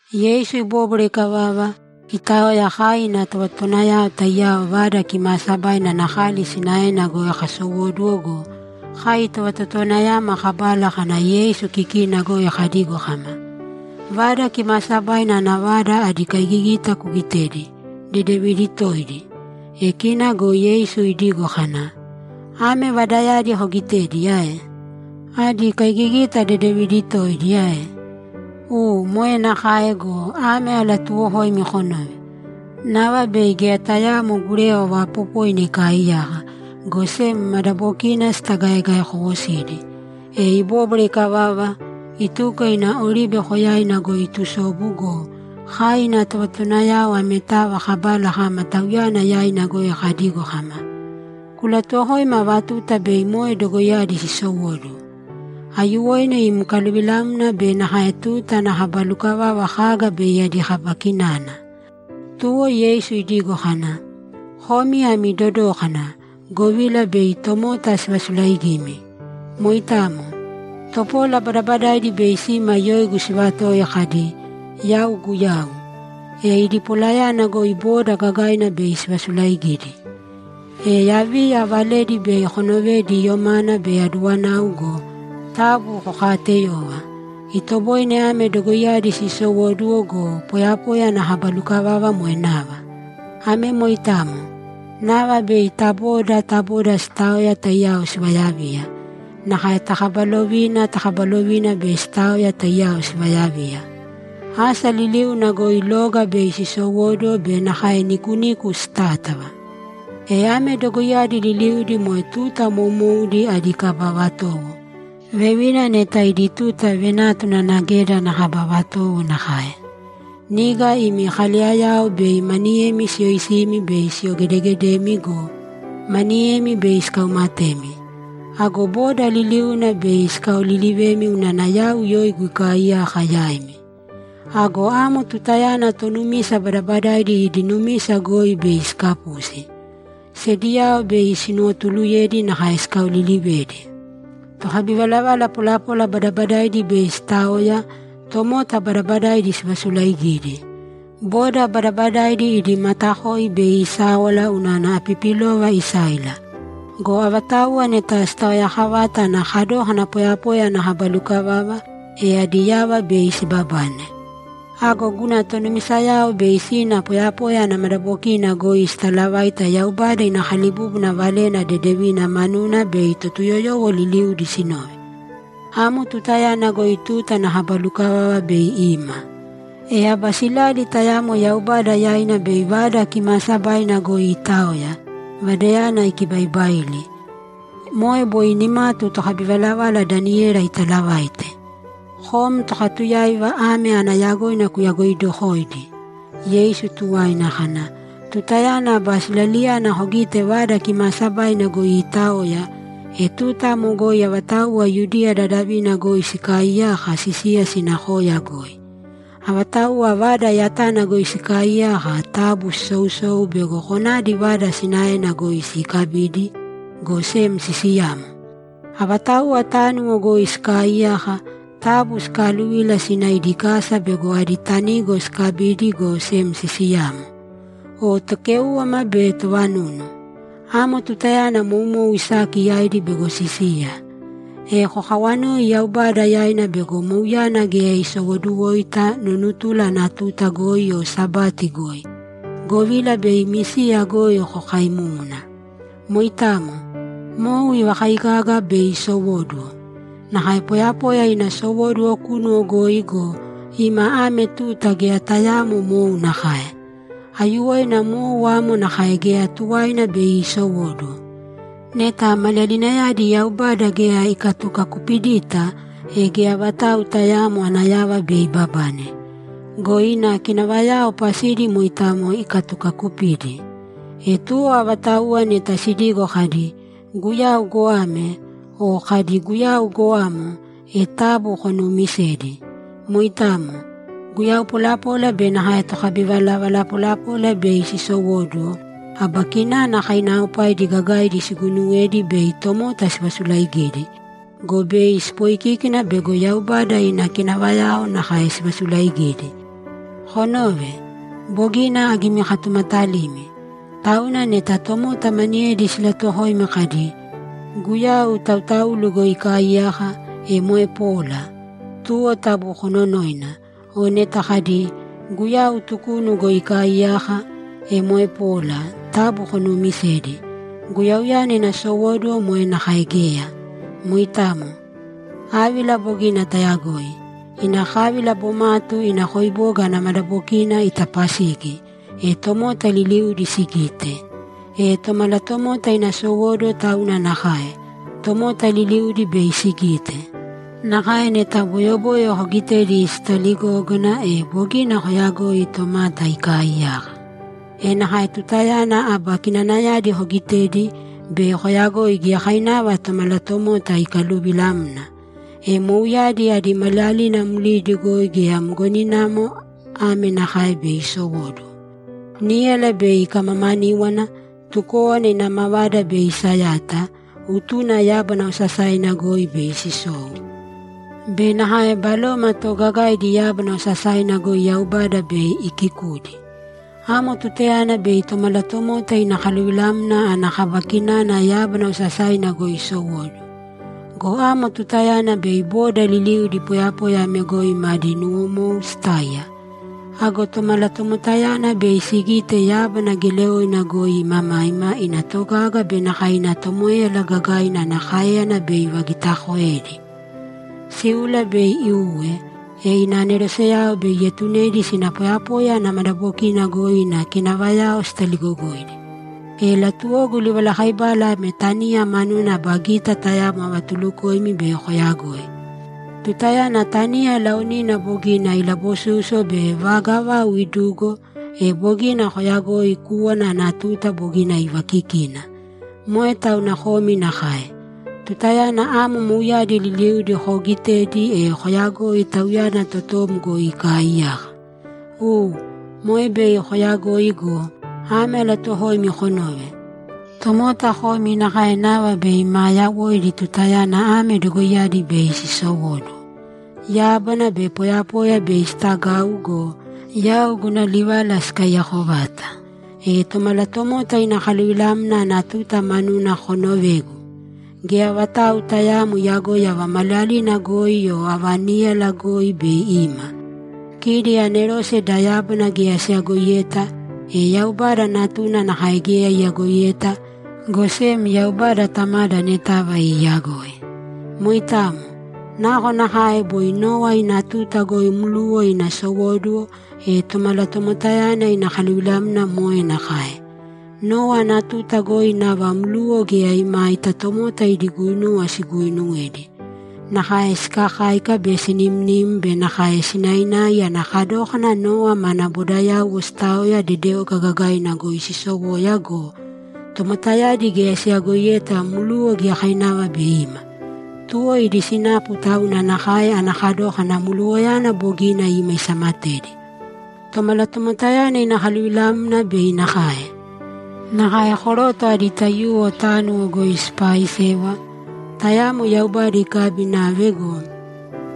Yeisu ibóbwara ikavava, itaoya, kai ina tovatotowanayao taiyao Vada Kimaasabaina ana kali sinaena goi kasowóduwo go, kai tovatotowanayama kabala kana Yeisu kikina goi kadigo kama, ‘Vada Kimaasabaina ana vada adi kaigigita kugitēdi, dedevidi toidi!’ E kina go Yeisu idigo kana, ‘Ame vadayadi kogitedi ae? Adi kaigigita dedevidi toidi ae? U, moe nakae go, ame alatuuwokoimi konōve: Nava bei geya tayaamo gurewa vaapopoina ikaaiyaka, go sem madabokina sitagaegaekowosidi.’ E ibóbwara ikavava, ituko ina Oribe Koyaina goi itusobu go, kai ina tovatotowanayao ametava kabala kama Tauyana yaina goi kadigo kama, ‘Kulatuwokōima ava tuta bei moe dogoiyadi sisowóduwo. Aiyuwoina im kaluvilamna be nakae tuta ana kaba lukavava kaga bei adi kaba kinana?’ Tuwo Yeisu idigo kana, ‘Komi ami dodōkana, govila bei tomota sivasulaigimi. Moitamo. Topola badabadaidi bei sima yoigu sivatoi kadi, “Yau Guyau.” E idi polayana goi boda gagaina bei sivasulaigidi. E yaviya valedi bei konovedi yomana be aduwanau go, taabu kokaateyōva. Itoboine ame dogoiyadi sisowóduwo go, poyapoya ana kaba lukavava moe nava. Ame moitamo. Nava bei ta boda ta boda sitaoya taiyao sivayaviya. Nakae ta kaba lovina ta kaba lovina bei sitaoya taiyao sivayaviya. Asa liliuna goi loga bei sisowóduwo be nakae nikuniku sitátava. E ame dogoiyadi liliudi moe tuta moumoudi adi kaba vatowo; vevina neta idi tuta venátuna ana geda ana kaba vatowo nakae. Niga imi kaleyayao bei maniyemi siyoisimi be siyogedegedemi go, maniyemi bei sikaumatemi. Ago boda liliuna bei sikaolilivemi unana yau yoigu ikaaiyaka yaimi. Ago amo tutayana tonumisa badabadaidi idi numisa goi bei sikapusi. Sediyao bei sinuwotuluyedi nakae sikaolilivedi. Tokabivalavala polapola badabadaidi bei sitaoya, tomota badabadaidi sivasulaigidi. Boda badabadaidi idi matakoi bei isáwala unana apipilova isáila. Go avatauwa neta sitaoyakavata ana kadókana poyapoya ana kaba lukavava, e adi yava bei sibabane. Ago guna tonumisayao bei sina poyapoya ana madabokina goi sitalavaita Yaubada ina kalibúbuna valena dedevina manuna bei Totuyoyowo liliudi sinove. Amo tutayana goi tuta ana kaba lukavava bei ima. E aba silali tayamo Yaubada yaina bei Vada Kimaasabaina goi iitaoya, Vadayana ikibaibaili. Moe boi nimatu tokabivalavala Daniyela itaalavaite.’ Kom tokatuyáiva ame ana yagoina kuyagoidokōidi! Yeisu tuwaina kana, ‘Tutayana aba silaliyana kogite Vada Kimaasabaina goi iitaoya, e tuta amo goi avatauwa Yudiya dadavina goi sikaaiyaka, sisīya sina koya goi. Avatauwa vada yatana goi sikaaiyaka, taabu sisousōu bego konadi vada sinaena goi sikabidi, go sem sisiyāmo. Avatauwa tánuwo goi sikaaiyaka, taabu sikaaluvīla sīna idi kasa bego adi tanigo sikabidi, go sem sisiyāmo. O tokéuwama be tovanunu! Amo tutayana moumou isaki yaidi bego sisiya. E kokawanōi Yaubada yaina bego mouyana geya isowoduwoita nunutula ana tuta goi o Sabati goi, govila bei imi siya goi kokaimúmuna. Moitamo. Mou ivakaigaga bei isowóduwo. Nakae poyapoya ina sowóduwo kunu goi go, ima ame tuta geya tayaamo mou nakae. Aiyuwoina mou amo nakae geya tuwaina bei iisowóduwo. Neta maliyalinayadi Yaubada geya ikatukakupidita, e geya vatau tayaamo ana yava bei ibabane. Go ina kinavayao pasidi moitamo ikatukakupidi. E tuwo avatauwa neta sidigo kadi, “Guyau goame!” o kadi, “Guyau goamo!” e taabu konuumisēdi. Moitamo. Guyau polapola be nakae tokabivalavala polapola bei sisowóduwo, aba kinana kainaaopaidi gagaidi siguuinuwedi bei tomota sivasulaaigidi. Go bei sipoikíkina bego Yaubada ina kinavayao nakae sivasulaigidi. Konōve. Bogina agimikatumatalimi. Tauna neta tomota maniyedi silatuwokoimi kadi, “Guyau tautaulu goi ikaaiyaka”, e moe pola, tuwo taabu kononōina. O neta kadi, “Guyau tukunu goi ikaaiyaka”, e moe pola, taabu konuumisēdi. Guyauyana ina sowóduwo moe nakae geya. Moitamo. Ávila bogina tayagoi. Ina kávila bomatu ina koiboga ana madabokina itapasigi, e tomota liliudi sigite. E Tomalatomota ina sowóduwo tauna nakae; tomota liliudi bei sigite. Nakae neta boyoboyo kogitedi sitaligógana, e bogina koyagoi tomata ikaaiyaka. E nakae tutayana aba kinanayadi kogitedi, bei koyagoi giyakainava Tomalatomota ikaluvilamna. E mouyadi adi maliyalina mlidi goi geya mgoninamo ame nakae bei isowóduwo: Níyala bei ikamamaníwana, tukówana ina mavada bei isayata, utuna yábana osasaina goi bei sisou be nakae baloma toogagaidi yábana osasaina goi Yaubada bei ikiikudi. Amo tutayana bei Tomalatomota ina kaluvilamna ana kaba kinana yábana osasaina goi isowóduwo. Go amo tutayana bei boda liliudi poyapoya ame goi madi nuwomou sitáiya. Ago Tomalatomotayana bei sigite yábana geleoina goi imamaima ina togaga be nakae ina tomoéyala gagaina ana káeyana bei ivagitaakoedi. Síula bei iuwe, e ina aneroseyao bei ietunedi sina poyapoya ana madabokina goi ina kinavayao sitaligogoidi. E latuwogu livalakaibala ame taniya manuna aba gita tayamo avatulukoimi bei koyagoi. Tutayana taniya laonina bogina silabosúsuwo be vaga vau idugo, e bogina koyagoi kúwana ana tuta bogina ivaakikina. Moe tauna komi nakae. Tutayana amo mouyadi liliudi koogitedi, e koyagōi Tauyana totom goi ikaaiyaka. U, moe bei kooyagoi go, ame alatuuwokoimi konōve: Tomota komi nakae nava bei maa yawoidi tutayana ame dogoiyadi bei sisowóduwo. Yábana be poyapoya bei sitagau go, yau guna livala sikaiyako vata. E Tomalatomota ina kaluvilamna ana tuta manuna konovēgu. Geya vatau tayaamo iyagoi ava maliyalina goi o ava níyala goi bei ima. Kidi anerose da yábana geya siyagoiyeta, e Yaubada Natuna nakae geya iyagoiyeta, go sem Yaubada Tamada anetava iiyagoi. Moitamo. Nakonakae boi Nowa ina tuta goi mluwa ina sowóduwo, e Tomalatomotayana ina kaluvilamna moe nakae. Nowa ana tuta goi nava mluwa geya imaita tomota idi guinuwa siguuinuwedi. Nakae sikakáika be sinimnim be nakae sinainai ana kadókana Nowa mana bodayauwo sitaoya dedeoga gagaina goi sisowoya go, tomotayadi geya siyagoiyeta mluwa giyakainava bei ima. Tuwo idi sinapu tauna nakae ana kadókana mluwayana bogina ima isamatedi. Tomalatomotayana ina kaluvilamna bei nakae. Nakae koroto adi taiyuwo tánuwo goi sipaaisewa; tayamo Yaubada ikabi inave go,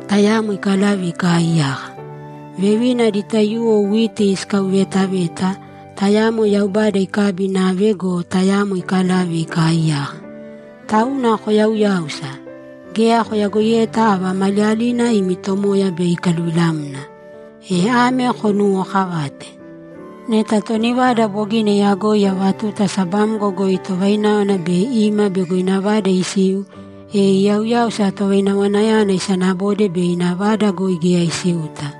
tayamo ikalave ikaaiyaka. Vevina adi taiyuwo witi sikauveetaveta, tayamo Yaubada ikabi inave go, tayamo ikalave ikaaiyaka. Tauna koyauyāusa! Geya koyagoiyeta ava maliyalina imi Tomoya bei ikaluvilamna. E ame konuwookavāte: Neta toni vada bogina iyagoi ava tuta sabamgo goi tovaináwana bei ima bego ina vada isiu, e iyauyáusa tovainawanayana isanabode bei ina vada goi geya isiuta.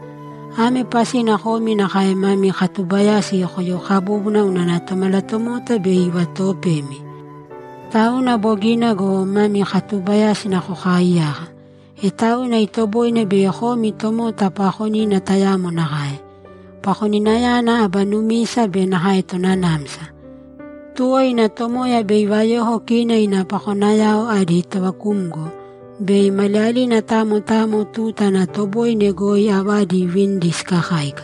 Ame pasina komi nakae mami katuubayasi koyokabūbuna unana Tomalatomota bei ivatoopemi. Tauna bogina go, mami katubayasi kokaiyāka. E tauna itoboine bei komi tomota paakonina tayamo nakae. Pakoninayana aba numisa be nakae tonanamsa. Tuwo ina tomoya bei ivayoko kina ina pakonayao adi tovakumgo, bei maliyalina tamo tamo tuta ana toboine goi avadi iivinidi sikakáika.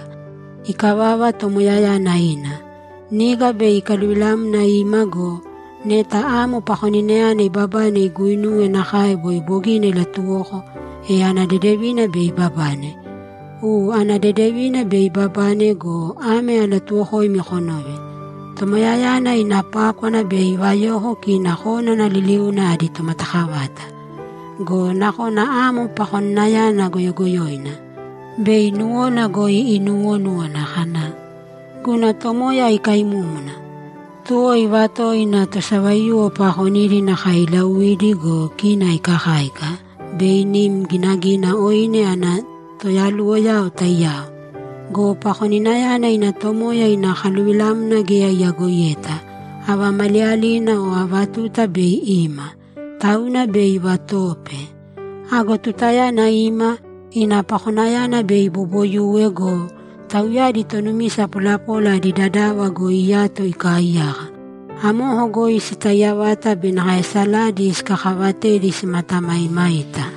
Ikavava, tomoyayana ina. Niga bei ikaluvilamna ima go, neta amo pakoninayana ibabane iguuinuwe nakae boi bogina ilatuwoko, e ana dedevina bei ibabane. U, ana dedevina bei ibabane go, ame alatuuwokoimi konōve: Tomoyayana ina pákwana bei ivayoko kina konana liliuna adi tomatakavata. Go nakona amo pakoninayana goyogoyoina. Bei nuwona goi inuwonúwana kana, “Guna tomoya ikaimúmuna.” Tuwo ivatowo ina tosavaiyuwo paakonidi nakae iilauidi go, kina ikakáika be inim ginagina oine ana toyaluwoyao taiyao. Go pakoninayana ina tomoya ina kaluvilamna geya iyagoiyeta, ava maliyalina o ava tuta bei ima. Tauna bei ivatoope. Ago tutayana ima, ina pakonayana bei iboboyuwe go, tauyadi tonumisa polapola adi dadava goi iyato ikaaiyaka. Amoko goi sitaiya vata be nakae saladi sikakaavatedi simatamaimaita.’